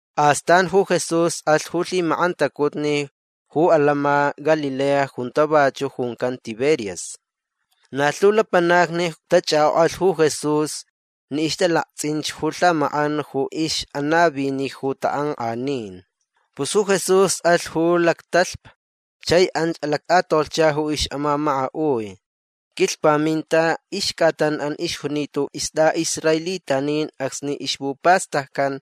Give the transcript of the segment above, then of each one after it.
Astan ju Jesús alh ju lhimak'antacutni ju atants'in Galilea junta vachu' juncan Tiberias. Na lhu lapanacni tach'ak'ok'alh ju Jesús ni ixtalakts'inch ju lhamak'an ju ix'anavini ju tak'ank'anin. Pus ju Jesús alh ju lactalhpa chai anch alact'atolhcha ju ix'amamaka'ui. Quilhpaminta ixc'atan'an ixjunita ju ist'a'israelitanin acsni ixpupastaccan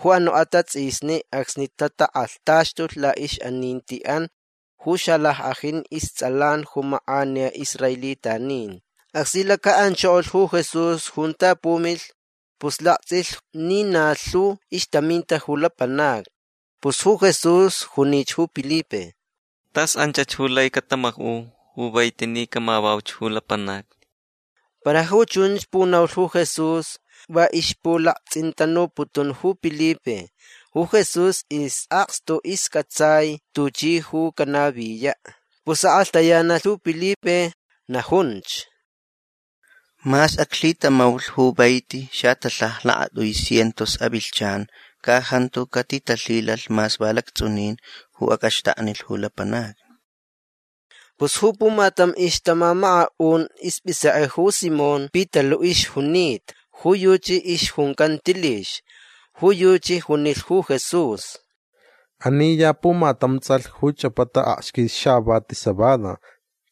ju anu' atats'isni acsni tatak'alhtaxtulh la'ix'aninti'an ju xalack'ajin ists'alan ju mak'aniya israelitanin. Acsni laca'anchokolh ju Jesús junta pumilh pus lakts'ilh ni na lhu ixtaminta ju lapanacni. Pus ju Jesús junich ju Pilipe: ―Tas anchach ju lai catama'u ju vaiti ni camavauch ju lapanacni. Para ju chunch punaulh ju Jesús va ixpulakts'intanuputun ju Pilipe. Ju Jesús is'akstu isc'atsai tuchi ju canaviya'. Pus ak'alhtayanalh ju Pilipe. Najunch: ―Mas aclhitamaulh ju vaiti xatalhaja lakat'ui cientos avilhchan ca jantu catitalhilalh mas va lacts'unin ju ac'axtaknilh ju lapanacni. Pus ju pumatam ixtamamaka'un isp'isek'e ju Simón Pitalu' ixjunita. Ju yuchi ixjuncan Tilix. Ju yuchi junilh ju Jesús: ―Ani ya pumatam ts'alh ju ch'apata aksquis xavati cebada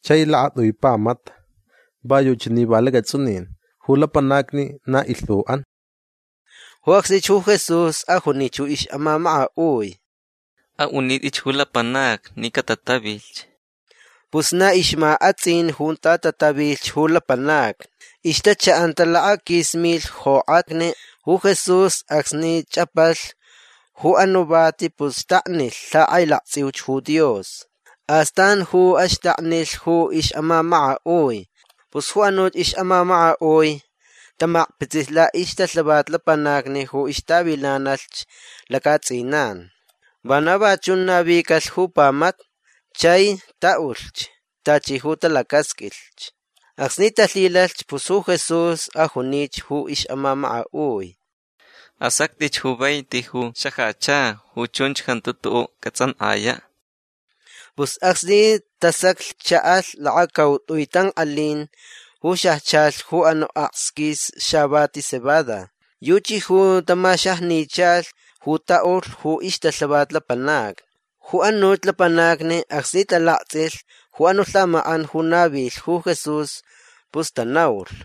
chai lakat'ui pamata. Va yuchi ni va lacats'unin. Ju lapanacni na ilhu'an. Ju acsnich ju Jesús ajunich ju ix'amamaka'ui: ―A'unit'itch ju lapanacni ni catatavilhch. Pus na ixma ats'in junta tatavilhch ju lapanacni. Ixtacha'anta lakaquis milh jok'atni. Ju Jesús acsni ch'apalh ju anu' vati pus xtaknilh lhak'ailakts'iuch ju Dios. Astan ju axtaknilh ju ix'amamaka'ui. Pus ju anuch ix'amamaka'ui tamakpitsilh la'ixtalhavat lapanacni ju ixtavilanalhch lacats'inan. Vana va chun navicalh ju pamata. Chai ta'ulhch tachi ju talacasq'uilhch. Acsni talhilalhch pus ju Jesús ajunich ju ix'amamaka'ui: ―Asact'itch ju vaiti ju xajacha. Ju chunch jantu tu'u' cats'ank'aya'. Pus acsni tasaclh cha'alh lakacaut'ui tank'alin ju xajchalh ju anu' aksquis xavati cebada. Yuchi ju tamaxajnichalh ju ta'ulh ju ixtalhavat lapanacni. Ju anuch lapanacni acsni talakts'ilh ju anu' lhamak'an ju navilh ju Jesús pus tanaulh: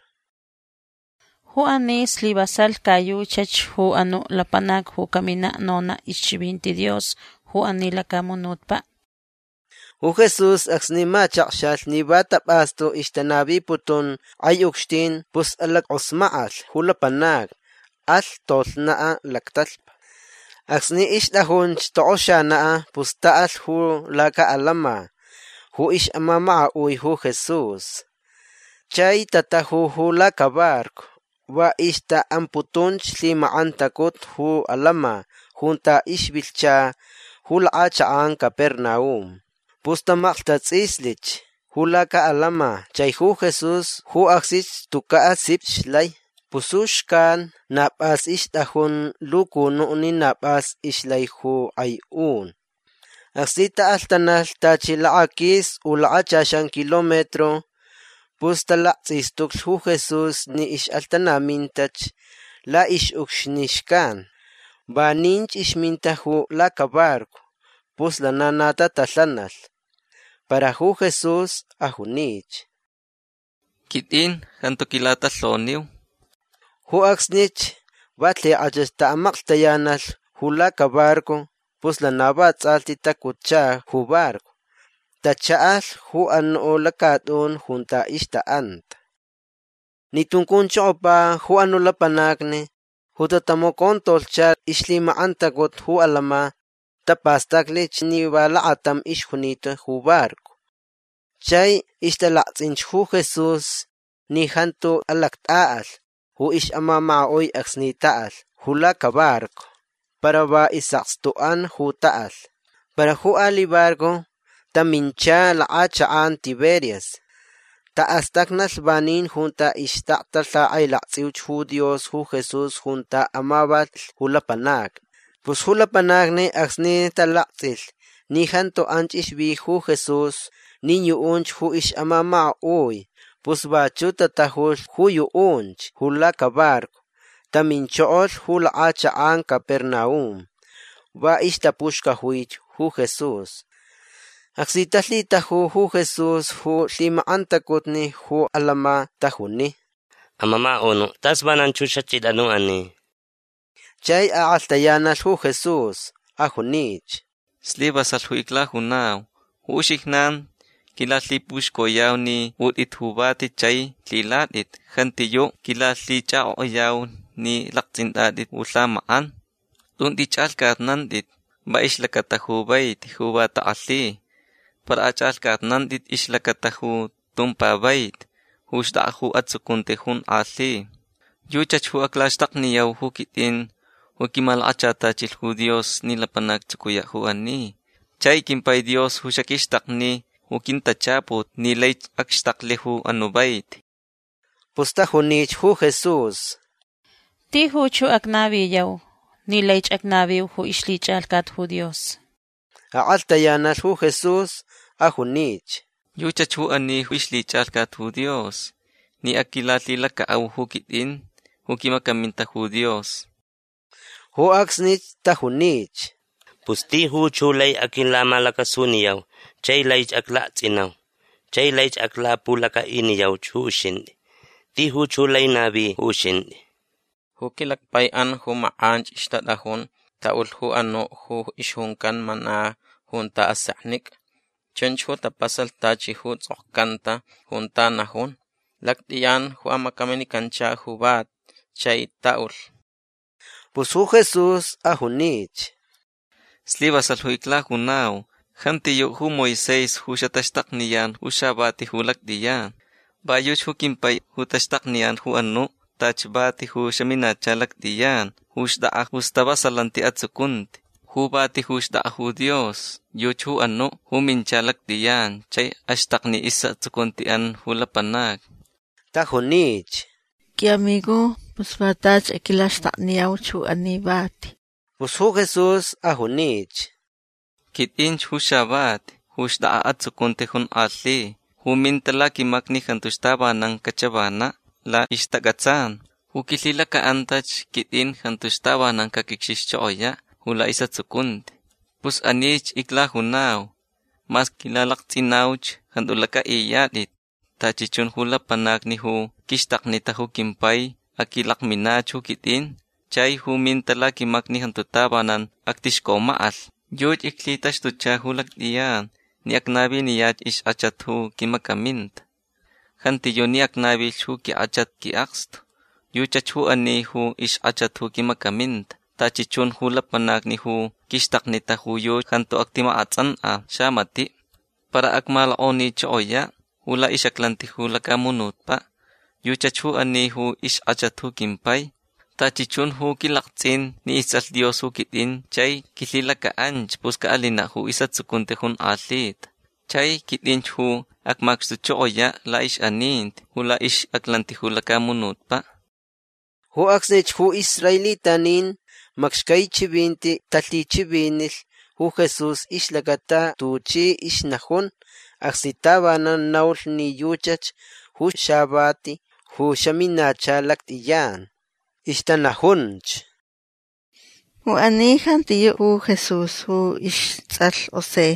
―Ju ani slivasalh ca yuchach ju anu' lapanac ju caminach nona' ixchivinti Dios ju ani lacamunutpa'. Ju Jesús acsni machakxalh ni va tap'astu ixtanaviputun k'ai ucxtin pus alack'osmak'alh ju lapanacni. Alh tolhna' lactalhpa. Acsni ixt'ajunch tok'oxana' pus ta'alh ju laca'atants'in ju ix'amamaka'ui ju Jesús. Chai tataju ju lacabarco. Va ixta'amputunch lhimak'antacutni ju atants'in junta ixvilhcha ju lak'achak'an Capernaum. Pus tamaklhtats'islich ju laca'atants'in chai ju Jesús ju acsni tuca' sip ixlai. Pus ju xcan na p'as ixt'ajun lucunu' ni na p'as ixlai ju k'ai un. Acsni ta'alhtanalh tachi lakaquis u lakachaxan kilometro pus talakts'istuclich ju Jesús ni ix'alhtanamintach la'ix'ucxni xcan. Vaninch ixminta ju lacabarco. Pus lana na tatalhanalh. Para ju Jesús ajunich: ―Quit'in. Jantu aquilatalhoniu. Ju acsnich va lhik'ach ta'amaklhtayanalh ju lacabarco. Pus lana va ts'alhti tacutcha ju barco. Tacha'alh ju anu' lacat'un junta ixta'anta. Ni tuncunchokopa ju anu' lapanacni ju tatamacontolhcha ixlhilak'antacutni ju atants'in tapastaclich ni va lakatam ixjunita ju barco. Chai ixtalakts'inch ju Jesús ni jantu alact'a'alh ju ix'amamaka'ui acsni ta'alh ju lacabarco. Para va is'akstu'an ju ta'alh. Para ju ali' barco tamincha ju lak'achak'an Tiberias. Ta'astacnalh vanin junta ixtakta lak'ailakts'iuch ju Dios ju Jesús junta amavalh ju lapanacni. Pus ju lapanacni acsni talakts'ilh ni jantu anch ixvi ju Jesús nin yu'unch ju ix'amamaka'ui pus vachu' tatajulh ju yu'unch ju lacabarco. Taminchokolh ju lak'achak'an Capernaum. Va ixtapuxcajui ju Jesús. Acsni talhitaju ju Jesús ju lhimak'antacutni ju atants'in tajuni: ―Amamaka'unu' tas vananch ju xach'it'an ju ani. Chai ak'alhtayanalh ju Jesús. Ajunich: ―Slivasalh ju iclajunau. Ju uxijnan quilalhipuxcoyau ni ut'it ju vati chai lhilat'it. Jantiyu' quilalhich'ak'ok'ayau ni lakts'int'at'it ju lhamak'an. Tun t'ich'alhc'atnant'it va ixlacata ju vaiti ju va tak'alhi. Para ach'alhc'atnant'it ixlacata ju tumpa vaiti ju xt'ak'a ju atsucunti jonk'alhi. Yuchach ju aclaxtakniyau ju quit'in ju quimalakachatachilh ju Dios ni lapanac actsucuya' ju ani. Chai quimpai Dios ju xaquixtakni ju quintachaput ni laich acxtaklh ju anu' vaiti. Pus tajunich ju Jesús: ―Tijuch ju acnaviyau ni laich acnaviu ju ixlhich'alhcat ju Dios. Ak'alhtayanalh ju Jesús. Ajunich: ―Yuchach ju ani ju ixlhich'alhcat ju Dios ni aquilalhilaca'au ju quit'in ju quimacaminta ju Dios. Ju acsnich tajunich: ―Pus tijuch ju lai aquilamalacasuniyau chai laich aclakts'inau chai laich aclapulaca'iniyauch ju uxint'i. Tijuch ju lai navi ju uxint'i. Ju quilacpai'an ju mak'anch ixtat'ajun ta'ulh ju anu' ju ixjuncan mana junta aseknic'a. Chunch ju tapasalh tachi ju ts'okcanta junta najun: “Lact'iyan ju amacaminicancha ju vati. Chai ta'ulh”. Pus ju Jesús ajunich: ―Slivasalh ju iclajunau. Jantiyu' ju Moisés ju xataxtakniyan ju xavati ju lact'iyan. Va yuchi ju quimpai ju taxtakniyan ju anu' tachi vati ju xaminacha lact'iyan ju xt'ak'a ju stavasalanti atsucunti. Ju vati ju xt'ak'a ju Dios yuchi ju anu' ju mincha lact'iyan chai axtakni is'atsucunti'an ju lapanacni. Tajunich: ―Qui'amigo pus va tachi aquilaxtakniyauch ju ani vati. Pus ju Jesús ajunich: ―Quit'inch ju xavati ju xt'ak'a atsucunti jonk'alhi. Ju minta laquimacni jantuch tavanan cachavana' la'ixtac'atsan. Ju quilhilaca'antach quit'in jantuch tavanan caquicxixchokoya' ju la'is'atsucunti. Pus anich iclajunau. Mas quilalakts'inauch jantu lac'a'iyat'it. Tachi chun ju lapanacni ju quixtaknita ju quimpai aquilakminach ju quit'in. Chai ju minta laquimacni jantu tavanan actixcomak'alh. Yuchi iclhitaxtucha ju lact'iyan ni acnaviniyach ixk'achat ju quimacaminta. Jantiyu' ni acnavilh ju quink'achat qui'akstu. Yuchach ju ani ju ixk'achat ju quimacaminta. Tachi chun ju lapanacni ju quixtaknita ju yuchi jantu actimak'ats'ank'a xamati'. Para ac'amalok'onichokoya' ju la'ix'aclanti ju lacamunutpa'. Yuchach ju ani ju ixk'achat ju quimpai. Tachi chun ju quilakts'in ni ists'alh Dios ju quit'in chai quilhilaca'anch pus ca'alina' ju is'atsucunti jonk'alhita. Chai quit'inch ju acmacxtuchokoya' la'ix'aninti ju la'ix'aclanti ju lacamunutpa'. Ju acsnich ju israelitanin macxcai chivinti talhichivinilh ju Jesús ixlacata tuchi ixnajun acsni tavanan naulh ni yuchach ju xavati ju xamincha lact'iyan. Ixtanajunch: ―Ju ani ja jantiyu' ju Jesús ju ists'alh José.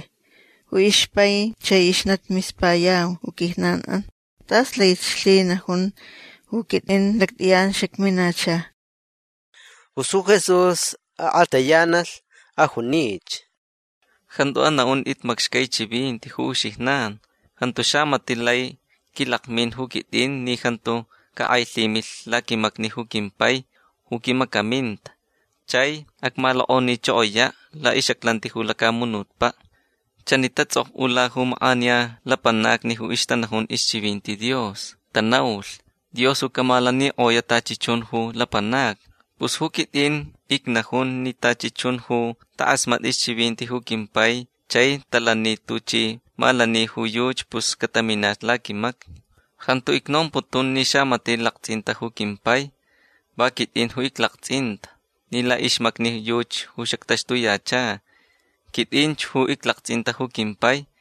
Ju ixpai chai ixnati mispayau ju quijnan'an. Tas laich lhinajun: “Ju quit'in lact'iyan xacminacha”. Pus ju Jesús ak'alhtayanalh. Ajunich: ―Jantu ana'unt'it macxcai chivinti ju uxijnan. Jantu xamati' lai quilakmin ju quit'in ni jantu cak'ailhimilh laquimacni ju quimpai ju quimacaminta. Chai acmalok'onichokoya' la'ix'aclanti ju lacamunutpa'. Chani tats'ok'ula ju mak'aniya lapanacni ju ixtanajun ju ixchivinti Dios. Tanaulh: “Dios ju camalanik'oya' tachi chun ju lapanacni”. Pus ju quit'in icnajun ni tachi chun ju tak'asmatni ixchivinti ju quimpai chai talani tuchi malani ju yuchi pus cataminach laquimacni. Jantu icnomputun ni xamati' lakts'inta ju quimpai. Va quit'in ju iclakts'inta ni la'ixmacni yuchi ju xactaxtuyacha. Quit'inch ju iclakts'inta ju quimpai.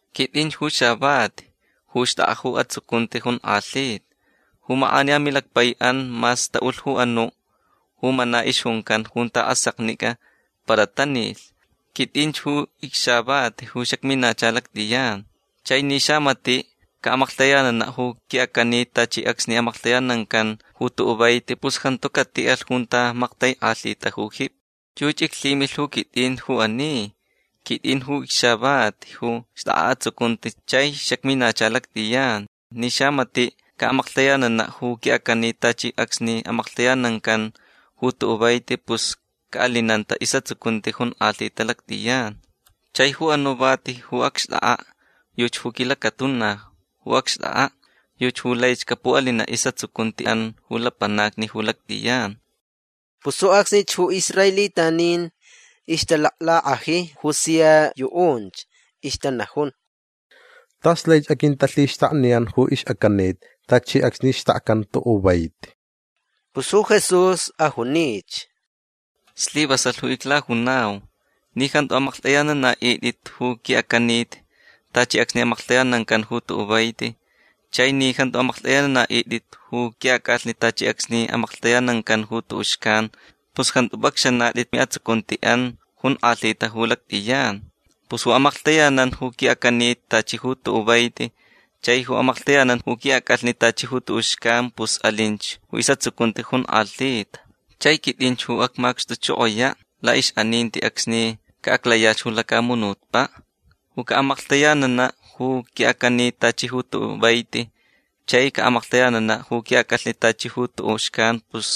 Quit'inch ju xavati ju xt'ak'a ju atsucunti jonk'alhita. Ju mak'aniya milacpai'an mas ta'ulh ju anu' ju mana ixjuncan junta aseknic'a para tanilh. Quit'inch ju icxavati ju xacminacha lact'iyan. Chai ni xamati' ca'amaklhtayanana' ju qui'acanit tachi acsni amaklhtayanancan ju tu'u' vaiti pus jantu cati'alh junta maktaik'alhita ju jipi. Yuchi iclhimilh ju quit'in ju ani. Quit'in ju icxavati ju xt'ak'a atsucunti chai xacminacha lact'iyan. Ni xamati' ca'amaklhtayanana' ju qui'acanit tachi acsni amaklhtayanancan ju tu'u' vaiti pus ca'alinanta is'atsucunti jonk'alhita lact'iyan. Chai ju anu' vati ju acxt'ak'a' yuchi ju quilacatuna ju acxt'ak'a'. Yuchi ju laich capu'alina' is'atsucunti'an ju lapanacni ju lact'iyan. Pus ju acsni ju israelitanin ixtalaclak'aji ju sia yu'unch. Ixtanajun: ―Tas laich aquintalhixtakniyan ju ix'acanit tachi acsni xtakcan tu'u' vaiti. Pus ju Jesús ajunich: ―Slivasalh ju iclajunau. Ni jantu amaklht'ayanana'it'it ju qui'acanit tachi acsni amaklhtayanancan tu'u' vaiti chai ni jantu amaklht'ayanana'it'it ju qui'ac'alhni tachi acsni amaklhtayanancan tu'u' xcan pus jantu p'acxanat'it mi'atsucunti'an jonk'alhita ju lact'iyan. Pus ju amaklhtayanan ju qui'acanit tachi tu'u' vaiti chai ju amaklhtayanan ju qui'ac'alhni tachi ju tu'u' xcan pus alinch ju is'atsucunti jonk'alhita. Chai quit'inch ju acmacxtuchokoya' la'ix'aninti acsni ca'aclayach ju lacamunutpa'. Ju ca'amaklhtayanana' ju qui'acanit tachi ju tu'u' vaiti chai ca'amaklhtayanana' ju qui'ac'alhni tachi ju tu'u' xcan pus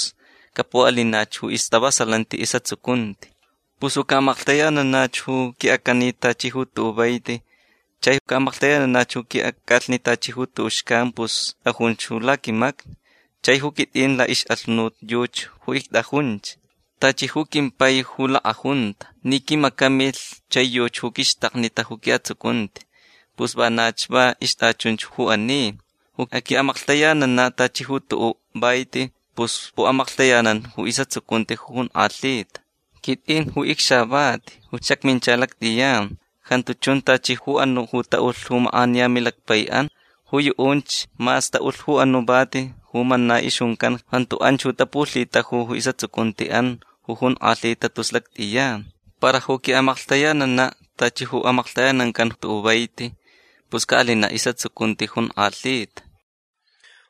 capu'alinach ju istavasalanti is'atsucunti. Pus ju ca'amaklhtayanana' ju qui'acanit tachi ju tu'u' vaiti chai ca'amaklhtayanana' ju qui'ac'alhni tachi ju tu'u' xcan pus t'ajunch ju laquimacni. Chai ju quit'in la'ix'alhunut yuchi ju ict'ajunch. Tachi ju quimpai ju lak'ajunta ni quimacamilh chai yuchi ju quixtaknita ju qui'atsucunti pus vanach va ixt'achunch ju ani. Ju aqui'amaklhtayanana' tachi ju tu'u' vaiti pus pu'amaklhtayanan ju is'atsucunti ju jonk'alhita. Quit'in ju icxavati ju xacmincha lact'iyan. Jantu chun tachi ju anu' ju ta'ulh ju mak'aniya milacpai'an. Ju yu'unch mas ta'ulh ju anu' vati ju mana ixjuncan jantu anch ju tapulhitaju is'atsucunti'an ju jonk'alhita tus lact'iyan. Para ju aqui'amaklhtayanana' tachi ju amaklhtayanancan tu'u' vaiti pus ca'alina' is'atsucunti jonk'alhita.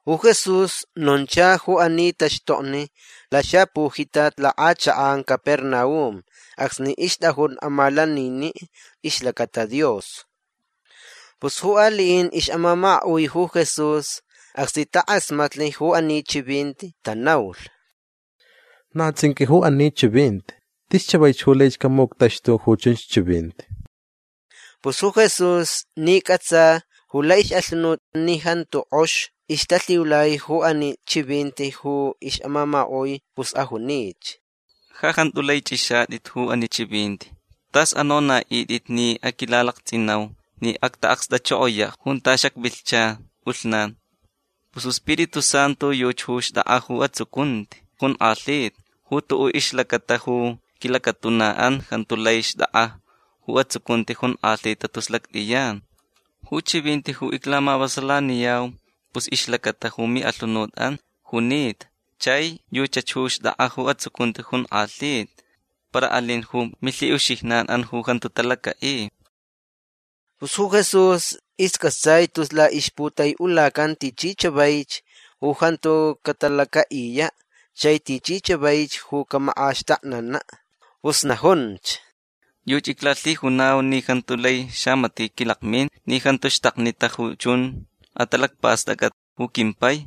Ju Jesús noncha ju ani taxtokni laxapujitat lak'achak'an Capernaum acsni ixt'ajun amalanini' ixlacata Dios. Pus ju ali'in ix'amamaka'ui ju Jesús acsni tak'asmatlh ju ani chivinti tanaulh: ―Na ts'inq'ui ju ani chivinti. Tis chavaich ju laich camuctaxtu ju chunch chivinti. Pus ju Jesús ni c'atsa ju la'ix'alhunut ni jantu k'ox ixtalhiulai ju ani chivinti ju ix'amamaka'ui pus ajunich: ―Ja jantu lai ch'ixat'it ju ani chivinti. T'as anona'it'it ni aquilalakts'inau ni acta'akst'achokoya' junta xacvilhcha p'ulhnan. Pus ju Spiritu Santu yuchi ju xt'ak'a ju atsucunti jonk'alhita. Ju tu'u' ixlacata ju quilacatuna'an jantu lai xt'ak'a ju atsucunti jonk'alhi tus lact'iyan. Ju chivinti ju iclamavasalaniyau pus ixlacata ju mi'alhunut'an junita chai yuchach ju xt'ak'a ju atsucunti jonk'alhita. Para alin ju milhi'uxijnan'an ju jantu talaca'i. Pus ju Jesús isc'atsai tus la'ixputai'ulacan tichi chavaich ju jantu catalaca'iya' chai tichi chavaich ju camak'axtaknana'. Pus najunch: ―Yuchi iclalhijunau ni jantu lai xamati' quilakmin ni jantu xtaknita ju chun atalacpast'ac'at ju quimpai.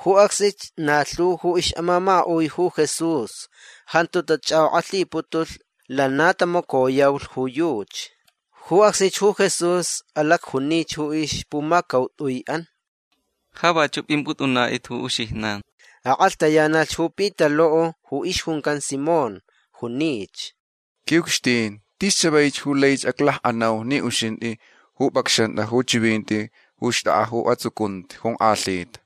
Ju acsnich na lhu ju ix'amamaka'ui ju Jesús jantu tach'ak'ok'ak'alhiputulh. Lana tamacoyaulh ju yuchi. Ju acsnich ju Jesús alacjunich ju ixpumacaut'ui'an: ―Ja vachu' p'imp'ut'unat'it ju uxijnan. Ak'alhtayanalh ju Pitalu' ju ixjuncan Simón. Junich: ―Qui'ucxtin tis chavaich ju lai aclak'anauch ni uxint'i ju p'acxant'a ju chivinti ju xt'ak'a ju atsucunti jonk'alhita.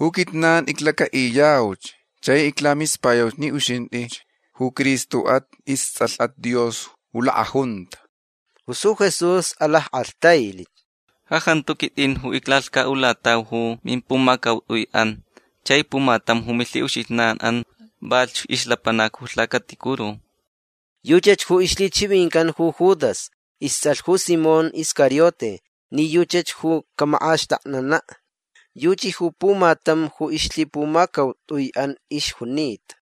Ju quijnan iclaca'iyauch chai iclamispayauch ni uxint'ich ju Cristo'at. Ists'alh'at Dios ju lak'ajunta. Pus ju Jesús alack'alhtailh: ―Ja jantu quit'in ju iclalhca'ulatau ju mimpumacaut'ui'an. Chai pumatam ju milhi'uxijnan'an valhch ixlapanac ju lhacaticuru. Yuchach ju ixlhichivincan ju Judas ists'alh ju Simón Iscariote ni yuchach ju camak'axtaknana'. Yuchi ju pumatam ju ixlhipumacaut'ui'an ixjunita.